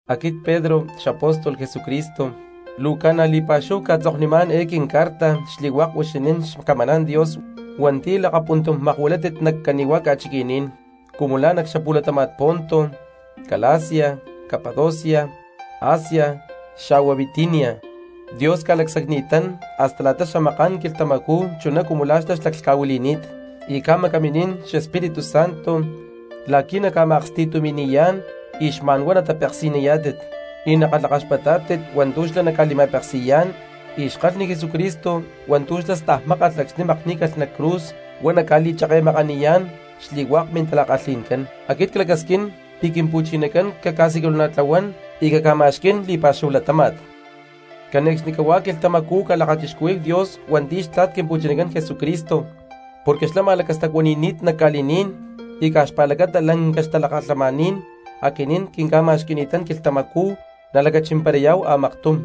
Aquit Pedro xapóstol Jesucristo, luu ca̠na li̠pa̠xúhu cca̠tzoknimá̠n eé quincarta xli̠hua̠k huixinín xcamaná̠n Dios hua̠nti̠ lakapuntum makuilátit nac cani̠hua̠ ca̠chiqui̠ní̠n, cumu la̠ nac xapu̠latama̠n Ponto, Galacia, Capadocia, Asia xa̠hua Bitinia. Dios ca̠lacsacni̠tán hasta la̠ta xamaká̠n quilhtamacú chuná cumu la̠ xlá xlaclhca̠huili̠ni̠t, y ca̠macaminín xEspíritu Santo la̠qui̠ naca̠ma̠aksti̠tumi̠li̠yá̠n y xma̠n huá natapeksi̠niyá̠tit y nakalhakaxpatá̠tit hua̠ntu̠ xlá naca̠li̠ma̠peksi̠yá̠n y xkalhni Jesucristo hua̠ntu̠ xlá stajmakani̠t acxni̠ makní̠calh nac cruz huá naca̠li̠cheke̠makaniyá̠n xli̠hua̠k mintala̠kalhi̠ncán. Aquit clacasquín pi̠ Quimpu̠chinacán caca̠siculana̠tlahuán y caca̠ma̠xquí̠n li̠pa̠xúhu latáma̠t. Cane̠cxnicahuá quilhtamacú calakachixcuhuí̠hu Dios hua̠nti̠ xtla̠t Quimpu̠chinacán Jesucristo porque xlá ma̠lacastacuani̠ni̠t nac ca̠li̠ní̠n y caj xpa̠lacata lanca xtalakalhamaní̠n aquinín quinca̠ma̠xqui̠ni̠tán quilhtamacú nalacachimparayá̠hu a̠maktum.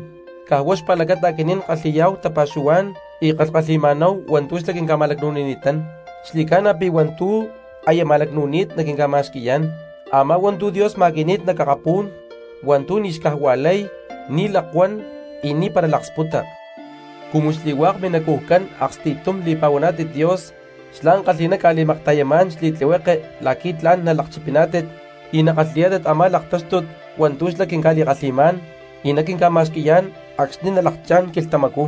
Caj huá xpa̠lacata aquinín kalhi̠yá̠hu tapa̠xuhuá̠n y kalhkalhi̠ma̠náhu hua̠ntu̠ xlá quinca̠ma̠lacnu̠nini̠tán. Xli̠ca̠na pi̠ hua̠ntu̠ aya ma̠lacnu̠ni̠t naquinca̠ma̠xqui̠yá̠n, a̠má hua̠ntu̠ Dios ma̠qui̠ni̠t nac akapú̠n, hua̠ntu̠ ni̠ xcajua̠lay, ni̠ lakuán, y ni̠para laksputa. Cumu xli̠hua̠k minacujcán aksti̠tum li̠pa̠huaná̠tit Dios xlá ankalhi̠ná ca̠li̠makta̠yamá̠n xli̠tlihueke la̠qui̠ tla̠n nalakchipiná̠tit y nakalhi̠yá̠tit a̠má laktáxtut hua̠ntu̠ xlá quinca̠li̠kalhi̠má̠n y naquinca̠ma̠xqui̠yá̠n acxni̠ nalakchá̠n quilhtamacú.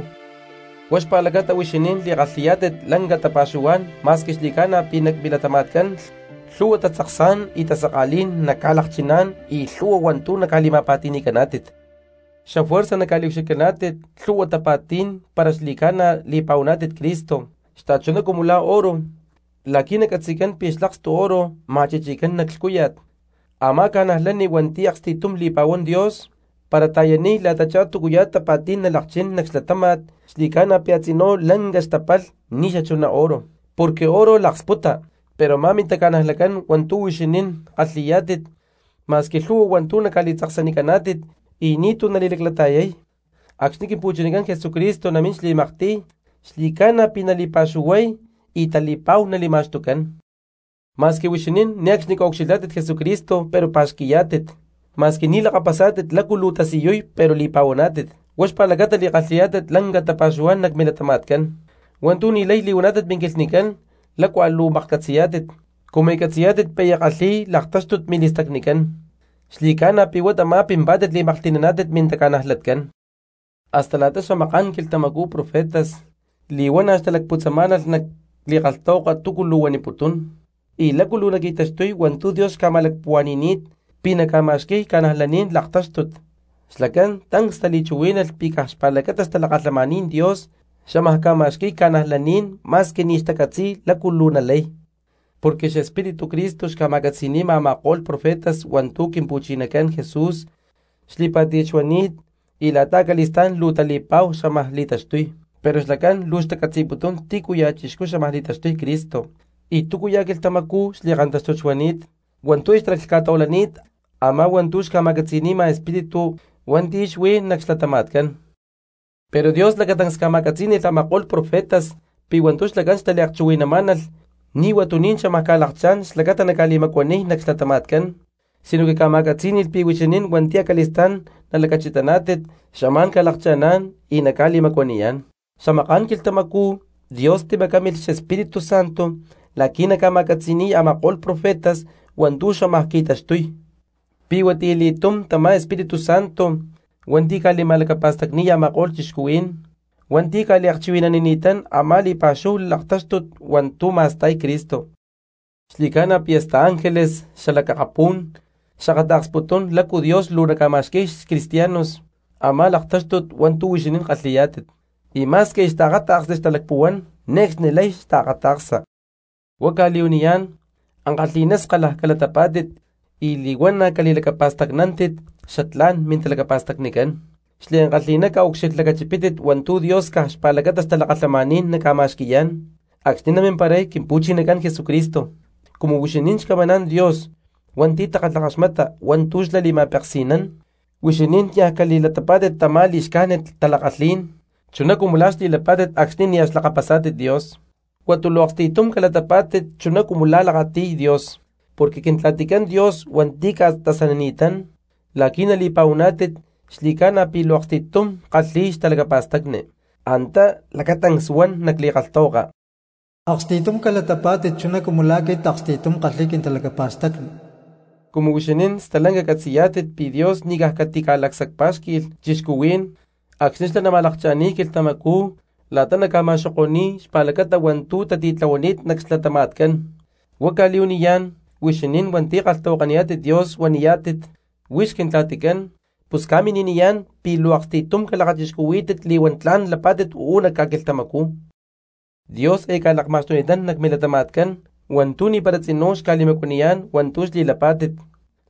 Huá xpa̠lacata huixinín li̠kalhi̠yá̠tit lanca tapa̠xuhuá̠n ma̠squi xli̠ca̠na pi̠ nac milatama̠tcán lhu̠hua tatzaksá̠n y tasaka̠lí̠n naca̠lakchiná̠n y lhu̠hua hua̠ntú naca̠li̠ma̠pa̠ti̠ni̠caná̠tit. Xafuerza naca̠liucxilhcaná̠tit lhu̠hua tapa̠tí̠n para xli̠ca̠na li̠pa̠huaná̠tit Cristo, xta̠chuná cumu la̠ oro, la̠qui̠ nacatzi̠cán pi̠ xlakstu oro ma̠chichicán nac lhcúya̠t. Amá cristiano hua̠nti̠ aksti̠tum li̠pa̠huán Dios, para ta̠yaniy la̠tachá túcuya̠ tapa̠tí̠n nalakchín nac xlatáma̠t xli̠ca̠na pi̠ a̠tzinú lanca xtapalh ni̠ xachuná oro, porque oro laksputa, pero a̠má mintaca̠najlatcán hua̠ntu̠ huixinín kalhi̠yá̠tit ma̠squi lhu̠hua hua̠ntu̠ ca̠li̠tzaksanicaná̠tit y ni̠tu̠ nali̠laclata̠yay, acxni̠ Quimpu̠chinacán Jesucristo namín xli̠maktiy xli̠ca̠na pi̠ nali̠pa̠xuhuay y tali̠pa̠hu nali̠ma̠xtucán. Ma̠squi huixinín ne̠cxnicú a̠ ucxilhá̠tit Jesucristo pero pa̠xqui̠yá̠tit, ma̠squi ni̠ lakapasá̠tit lácu luu tasiyuy pero li̠pa̠huaná̠tit, huá xpa̠lacata li̠kalhi̠yá̠tit lanca tapa̠xuhuá̠n nac milatama̠tcán, hua̠ntu̠ ni̠lay li̠huaná̠tit minquilhnicán lácua luu maklhcatzi̠yá̠tit, cumu catzi̠yá̠tit pi̠ aya kalhi̠y laktáxtut mili̠stacnicán; xli̠ca̠na pi̠ huá tamá pimpá̠tit li̠maklhti̠naná̠tit mintaca̠najlatcán. Hasta la̠ta xamaká̠n quilhtamacú profetas li̠huana̠ xtalacputzamá̠nalh nac li̠kalhtahuaka túcu luu huaniputún y lácu luu naqui̠taxtuy hua̠ntu̠ Dios xca̠ma̠lacpuhua̠ni̠ni̠t pi̠ naca̠ma̠xqui̠y cristianos laktáxtut, xlacán tancs tali̠chuhuí̠nalh pi̠ caj xpa̠lacata xtalakalhamaní̠n Dios xámaj ca̠ma̠xqui̠y cristianos ma̠squi ni̠ xtacatzi̠y lácu luu nalay. Porque xEspíritu Cristo xca̠ma̠catzi̠ni̠ma a̠ma̠ko̠lh profetas hua̠ntu̠ Quimpu̠chinacán Jesús xli̠pá̠ti̠t xuani̠t y la̠ta acali̠stá̠n luu tali̠pa̠hu xámaj li̠taxtuy; pero xlacán luu xtacatzi̠putún tícuya̠ chixcú xámaj li̠taxtuy Cristo y túcuya̠ quilhtamacú xli̠kanta̠xtut xuani̠t hua̠ntu̠ aya xtalaclhca̠tahuilani̠t a̠má hua̠ntu̠ xca̠ma̠catzi̠ni̠ma Espíritu hua̠nti̠ xuí nac xlatama̠tcán. Pero Dios lacatancs ca̠ma̠catzí̠ni̠lh a̠ma̠ko̠lh profetas pi̠ hua̠ntu̠ xlacán xtaliakchuhui̠namá̠nalh ni̠ huatuní̠n xámaj ca̠lakchá̠n xlacata naca̠li̠macuaniy nac xlatama̠tcán, sinoque ca̠ma̠catzí̠ni̠lh pi̠ huixinín hua̠nti̠ acali̠stá̠n nalacachitaná̠tit xamá̠n ca̠lakcha̠ná̠n y naca̠li̠macuaniyá̠n. Xamaká̠n quilhtamacú Dios timacámilh Espíritu Santo la̠qui̠ naca̠li̠ma̠catzi̠ni̠y a̠ma̠ko̠lh profetas hua̠ntu̠ xámaj qui̠taxtuy, pi̠ huatiyali̠túm tamá Espíritu Santo hua̠nti̠ ca̠li̠ma̠lacapa̠stacni̠y a̠ma̠ko̠lh cristianos hua̠nti̠ ca̠liakchuhui̠nanini̠tán a̠má li̠pa̠xúhu laktáxtut hua̠ntú ma̠sta̠y Cristo. ¡Xli̠cána pi̠ hasta ángeles xalac akapú̠n xakata̠ksputún lácu Dios luu naca̠ma̠xqui̠y cristianos a̠má laktáxtut hua̠ntu̠ huixinín kalhi̠yá̠tit y ma̠squi aya xtaakata̠ksli xtalacpuhuán ne̠cxni lay xta̠kata̠ksa! Huá cca̠li̠huaniyá̠n, ankalhi̠ná skalalh calatapá̠tit y li̠huana̠ cali̠lacapa̠stacnántit xatlá̠n mintalacapa̠stacnicán. Xliankalhi̠ná caucxilhlacachipítit hua̠ntu̠ Dios caj xpa̠lacata xtalakalhamaní̠n naca̠ma̠xqui̠yá̠n acxni̠ namimparay Quimpu̠chinacán Jesucristo. Cumu huixinín xcamaná̠n Dios hua̠nti̠ takalhakaxmata hua̠ntú xlá li̠ma̠peksi̠nán, huixinín nia cali̠latapá̠tit tamá li̠xcájnit tala̠kalhí̠n chuná cumu la̠ xli̠lapá̠tit acxni̠ niaj xlakapasá̠tit Dios. Huata luu aksti̠tum calatapá̠tit chuná cumu la̠ lakati̠y Dios, porque Quintla̠ticán Dios hua̠nti̠ ca̠tasanini̠tán la̠qui̠ nali̠pa̠huaná̠tit xli̠ca̠na pi̠ luu aksti̠tum kalhi̠y xtalacapa̠stacni. Antá lacatancs huan nac li̠kalhtahuaka: “Aksti̠tum calatapá̠tit chuná cumu la̠ aquit aksti̠tum ckalhi̠y quintalacapa̠stacni.” Cumu huixinín stalanca catzi̠yá̠tit pi̠ Dios ni̠ caj catica̠lacsacpá̠xqui̠lh cristianos acxni̠ xlá nama̠lakcha̠ni̠y quilhtamacú la̠ta naca̠ma̠xoko̠ni̠y xpa̠lacata hua̠ntú tatitlahuani̠t nac xlatama̠tcán, huá cca̠li̠huaniyá̠n, huixinín hua̠nti̠ kalhtahuakaniyá̠tit Dios huaniyá̠tit: “Huix Quintla̠ticán” pus ca̠mini̠niyá̠n pi̠ luu aksti̠tum calakachixcuhuí̠tit li̠huán tla̠n lapá̠tit uú nac ca̠quilhtamacú. Dios aya ca̠lakma̠xtuni̠tán nac milatama̠tcán hua̠ntu̠ ni̠para tzinú xca̠li̠macuaniyá̠n hua̠ntu̠ xli̠lapá̠tit,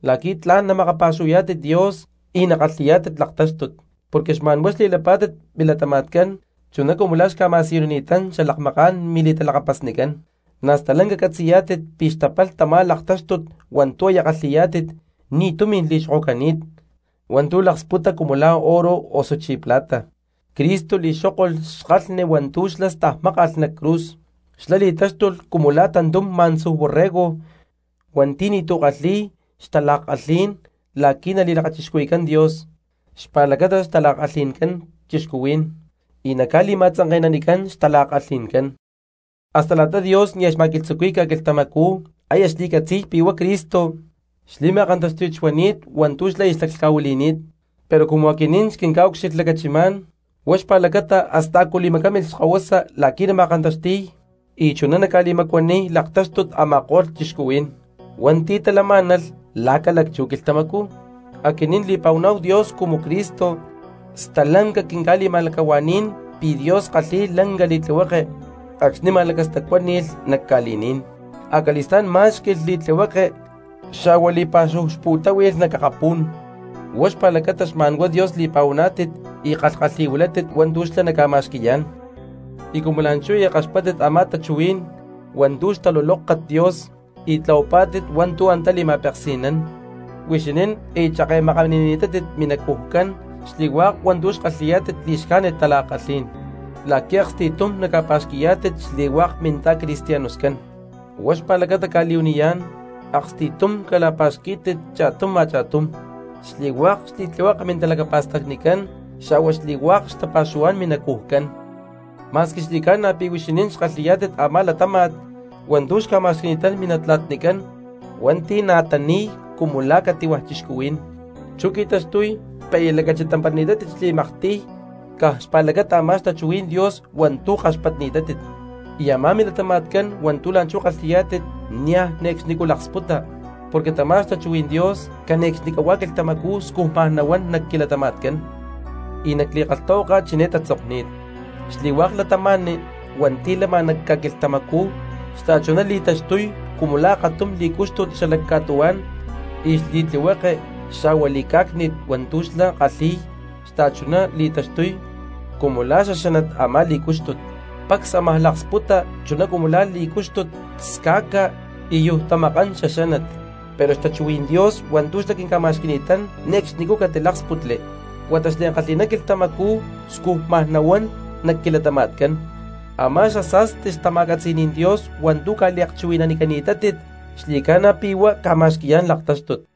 la̠qui̠ tla̠n namakapa̠xuhuayá̠tit Dios y nakalhi̠yá̠tit laktáxtut, porque xma̠nhuá xli̠lapá̠tit milatama̠tcán chuná cumu la̠ xca̠ma̠siyunini̠tán xalakmaká̠n mili̠talakapasnicán. Na̠ stalanca catzi̠yá̠tit pi̠ xtapalh tamá laktáxtut hua̠ntu̠ aya kalhi̠yá̠tit, ni̠ tumi̠n li̠xokocani̠t hua̠ntu̠ laksputa cumu la̠ oro osuchí plata, Cristo li̠xókolh xkalhni hua̠ntu̠ xlá stajmákalh nac cruz, xlá li̠táxtulh cumu la̠ tantum má̠ntzuj borrego hua̠nti̠ ni̠tu̠ kalhi̠y xtala̠kalhí̠n la̠qui̠ nali̠lakachixcuhui̠cán Dios xpa̠lacata xtala̠kalhi̠ncán cristianos y naca̠li̠ma̠tzanke̠nanicán xtala̠kalhi̠ncán. Hasta la̠ta Dios nia̠ xma̠lacatzuqui̠y ca̠quilhtamacú aya xli̠lacsacni̠t pi̠ huá Cristo xli̠ma̠kantáxti̠t xuani̠t hua̠ntú xlá xlaclhca̠huili̠ni̠t, pero cumu aquinín xquinca̠ucxilhlacachimá̠n huá xpa̠lacata hasta a̠cu timacámilh xkahuasa la̠qui̠ nama̠kanta̠xti̠y y chuná naca̠li̠macuaniy laktáxtut a̠ma̠ko̠lh cristianos hua̠nti̠ talamá̠nalh la̠ ca̠lacchú quilhtamacú. Aquinín li̠pa̠huaná̠hu Dios cumu Cristo stalanca quinca̠li̠ma̠lacahua̠ní̠n pi̠ Dios kalhi̠y lanca li̠tlihueke acxni̠ ma̠lacastacuáni̠lh nac ca̠li̠ní̠n, acali̠stá̠n má̠xqui̠lh li̠tlihueke xa̠hua li̠pa̠xúhu xputáhui̠lh nac akapú̠n; huá xpa̠lacata xma̠n huá Dios li̠pa̠huaná̠tit y kalhkalhi̠huilátit hua̠ntu̠ xlá naca̠ma̠xqui̠yá̠n. Y cumu la̠nchú aya kaxpatpá̠tit a̠má tachuhuí̠n hua̠ntú xtalulóktat Dios y tlahuapá̠tit hua̠ntu̠ antá li̠ma̠peksi̠nán, huixinín aya cheke̠makanini̠tátit minacujcán xli̠hua̠k hua̠ntú xkalhi̠yá̠tit li̠xcájnit tala̠kalhí̠n, la̠qui̠ aksti̠tum naca̠pa̠xqui̠yá̠tit xli̠hua̠k minta̠cristianoscán. Huá xpa̠lacata cca̠li̠huaniyá̠n, aksti̠tum cala̠pa̠xquí̠tit cha̠tum a̠cha̠tum xli̠hua̠k xli̠tlihueke mintalacapa̠stacnicán xa̠hua xli̠hua̠k xtapa̠xuhuá̠n minacujcán. Ma̠squi xli̠ca̠na pi̠ huixinín xkalhi̠yá̠tit a̠má latáma̠t hua̠ntu̠ xca̠ma̠xqui̠ni̠tán minatla̠tnicán hua̠nti̠ na̠ tani̠y cumu la̠ cati̠hua̠ cristianos, chú qui̠taxtuy pi̠ aya lacachitamparani̠tátit xli̠maktiy caj xpa̠lacata a̠má xtachuhuí̠n Dios hua̠ntu̠ kaxpatni̠tátit, y a̠má milatama̠tcán hua̠ntu̠ la̠nchú kalhi̠yá̠tit niaj ne̠cxnicú laksputa porque tamá xtachuhuí̠n Dios cane̠cxnicahuá quilhtamacú scujma nahuán nac quilatama̠tcán. Y nac li̠kalhtahuaka chiné tatzokni̠t: Xli̠hua̠k cristiano hua̠nti̠ lama nac ca̠quilhtamacú xta̠chuná li̠taxtuy cumu la̠ akatum li̠cúxtut xalac ca̠tuhuá̠n, y xli̠tlihueke xa̠hua li̠cá̠cni̠t hua̠ntu̠ xlá kalhi̠y xta̠chuná li̠taxtuy cumu la̠ xaxánat a̠má li̠cúxtut. Pacs ámaj laksputa chuná cumu la̠ li̠cúxtut sca̠ca y yujtamakán xaxánat, pero xtachuhuí̠n Dios hua̠ntu̠ xlá quinca̠ma̠xqui̠ni̠tán ne̠cxnicú catiláksputli huata xliankalhi̠ná quilhtamacú scujma nahuán nac quilatama̠tcán. Amá xasa̠sti xtama̠catzi̠ní̠n Dios hua̠ntú ca̠liakchuhui̠nanicani̠tátit xli̠ca̠na pi̠ huá ca̠ma̠xqui̠yá̠n laktáxtut.